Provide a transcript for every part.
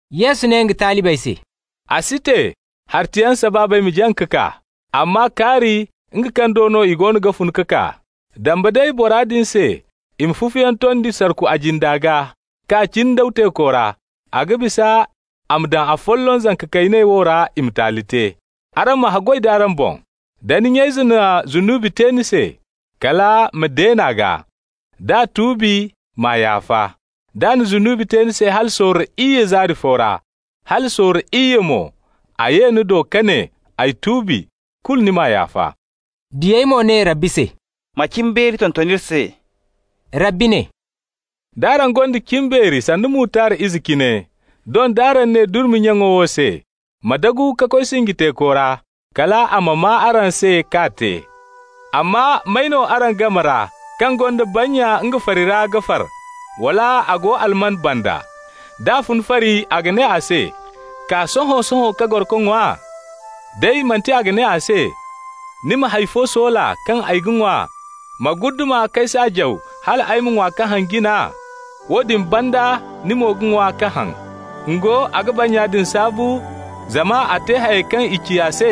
Yesu ne nga talibey se: «A si te hartayaŋ sabaabey ma jaŋ ka kaa, amma kaari nga kaŋ do no i goono ga fun ka kaa! Dambe day bora se i ma fufuyaŋ tondi sarku a jinda gaa k'a jindaw teeko ra, a ga bisa a ma daŋ afolloŋ zanka kayney wo ra i ma taali te. Araŋ ma haggoy d'araŋ boŋ. Da ni nya-ize na zunubi te ni se, kala ma deen'a gaa. D'a tuubi, m'a yaafa. D'a na zunubi te ni se hala sorro iyye zaari fo ra, hala sorro iyye mo a ma ye ni do ka ne: ‹Ay tuubi,› kulu ni m'a yaafa.» Diyey mo ne Rabbi se: «Ma cimbeeri tonton iri se.» Rabbi ne: «D'araŋ gonda cimbeeri sanda mutard ize cine, doŋ d'araŋ ne durmi nyaŋo wo se: ‹Ma dagu ka koy sinji teeko ra,› kal a ma maa araŋ se k'a te. Amma may no araŋ game ra kaŋ gonda bannya nga fari ra ga far, wala a go alman banda, d'a fun fari a ga ne a se: ‹Kaa sohõ-sohõ ka goro ka ŋwa?› Day manti a ga ne a se: ‹Ni ma hay fo soola kaŋ ay ga ŋwa, ma guddama k'ay saajaw hal ay ma ŋwa ka haŋ jina? Woodin banda ni mo ga ŋwa ka haŋ.› Ngo, a ga bannya din saabu zama a te hayey kaŋ i ci a se?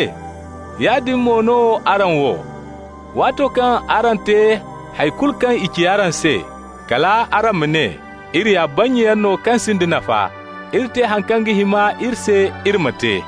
Yaadin mo no araŋ wo: waato kaŋ araŋ te hay kulu kaŋ i ci araŋ se, kal araŋ ma ne: ‹Iri ya bannyayaŋ no kaŋ sinda nafa. Iri te haŋ kaŋ ga hima iri se iri ma te.›»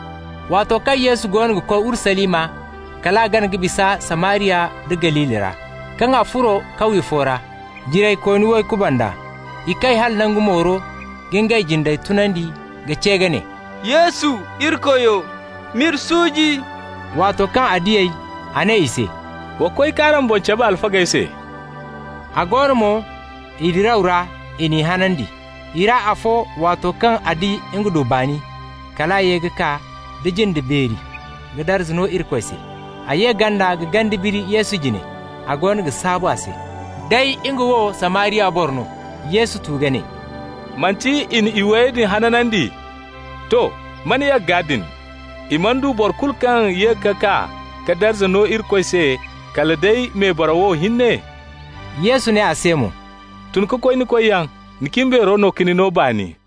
Waato kaŋ Yesu goono ga koy Urusalima, kal a gana ka bisa Samariya nda Galili ra. Kaŋ a furo kawye fo ra, jiraykooni way kuband'a. I kay hala nangu mooro ka ngey jindey tunandi ka ce ka ne: «Yesu, iri Koyo, m'iri suuji!» Waato kaŋ a di ey, a ne i se: «Wa koy k'araŋ boŋ cabe alfagey se.» A go no mo, i diraw ra, i n'i hanandi. I ra afo, waato kaŋ a di nga du baani, kal a ye ka kaa da jinde beeri ka darza no Irikoy se. A ye ganda ka gande biri Yesu jine, a goono ga saabu a se. Day nga wo Samariya boro no. Yesu tu ka ne: «Manti i na iway din hanandi? To, man yagga din? I mana du boro kulu kaŋ ye ka kaa ka darza no Irikoy se kala day mebaraw wo hinne?» Yesu ne a se mo: «Tun ka koy ni koyyaŋ. Ni cimbeero no ka ni no baani.»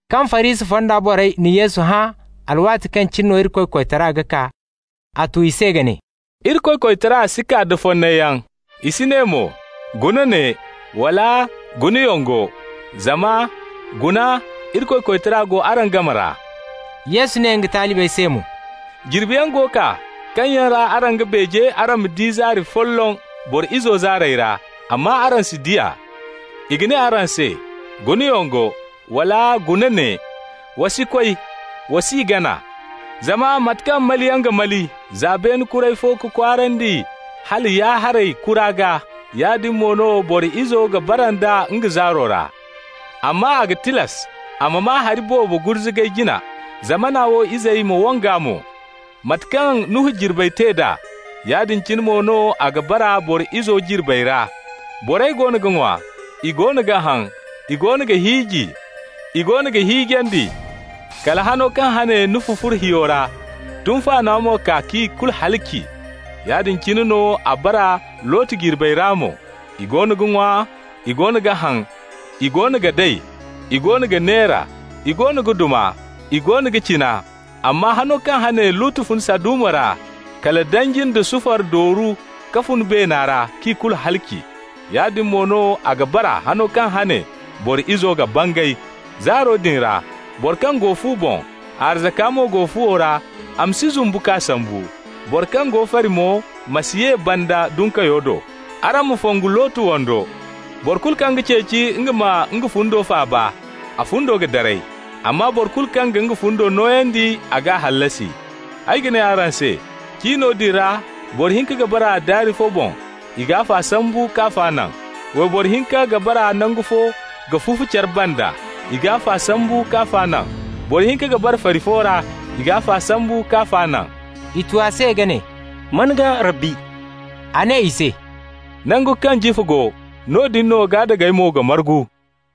Kaŋ Farisi fonda borey na Yesu hã alwaati kaŋ cine no Irikoy koytara ga kaa, a tu i se ka ne: «Irikoy koytara si kaa da fonnayyaŋ. I si ne mo: ‹Guna ne!› wala: ‹Guna yongo!› Zama guna, Irikoy koytara go araŋ game ra.» Yesu ne nga talibey se mo: «Jirbiyaŋ go kaa kaŋ yaŋ ra araŋ ga beeje araŋ ma di zaari folloŋ Boro Izo zaarey ra, amma araŋ si di a. I ga ne araŋ se: ‹Guna yongo!› wala: ‹Guna ne!› Wa si koy, wa s'i gana. Zama mate kaŋ maliyaŋ ga mali za beene kuray fo ka kwaarandi hala ya-haray kura gaa, yaadin mo no Boro Izo ga bara nd'a nga zaaro ra. Amma a ga tilas a ma maa hari boobo gurzugay jina, zamana wo izey ma wang'a mo. Mate kaŋ Nuhu jirbey te d'a, yaadin cine mo no a ga bara Boro Izo jirbey ra. Borey goono ga ŋwa, i goono ga haŋ, i goono ga hiiji, i goono ga hiijandi -- kala hano kaŋ hane Nuhu furo hiyo ra. Tunfaano mo kaa k'i kulu halaci. Yaadin cine no a bara Lotu jirbey ra mo: i goono ga ŋwa, i goono ga haŋ, i goono ga day, i goono ga neera, i goono ga duma, i goono ga cina. Amma hano kaŋ hane Lotu fun Saduma ra, kala danji nda sufar dooru ka fun beena ra, k'i kulu halaci. Yaadin mo no a ga bara hano kaŋ hane Boro Izo ga bangay. Zaaro din ra, boro kaŋ go fu boŋ, a arzaka mo go fuwo ra, a ma si zumbu k'a sambu. Boro kaŋ go fari mo ma si ye banda dunkayo do. Araŋ ma fongu Lotu wando. Boro kulu kaŋ ga ceeci nga ma nga fundo faaba, a fundo ga daray. Amma boro kulu kaŋ ga nga fundo nooyandi, a g'a hallasi. Ay ga ne araŋ se: cino din ra boro hinka ga bara daari fo boŋ, i g'afo sambu k'afa naŋ. Wayboro hinka ga bara nangu fo ga fufu care banda. I g'afa sambu k'afa naŋ. Boro hinka ga bara fari fo ra. I g'afa sambu k'afa naŋ.» I tu a se ka ne: «Man gaa, Rabbi?» A ne i se: «Nangu kaŋ jifa go, noodin no gaadagey mo ga margu.»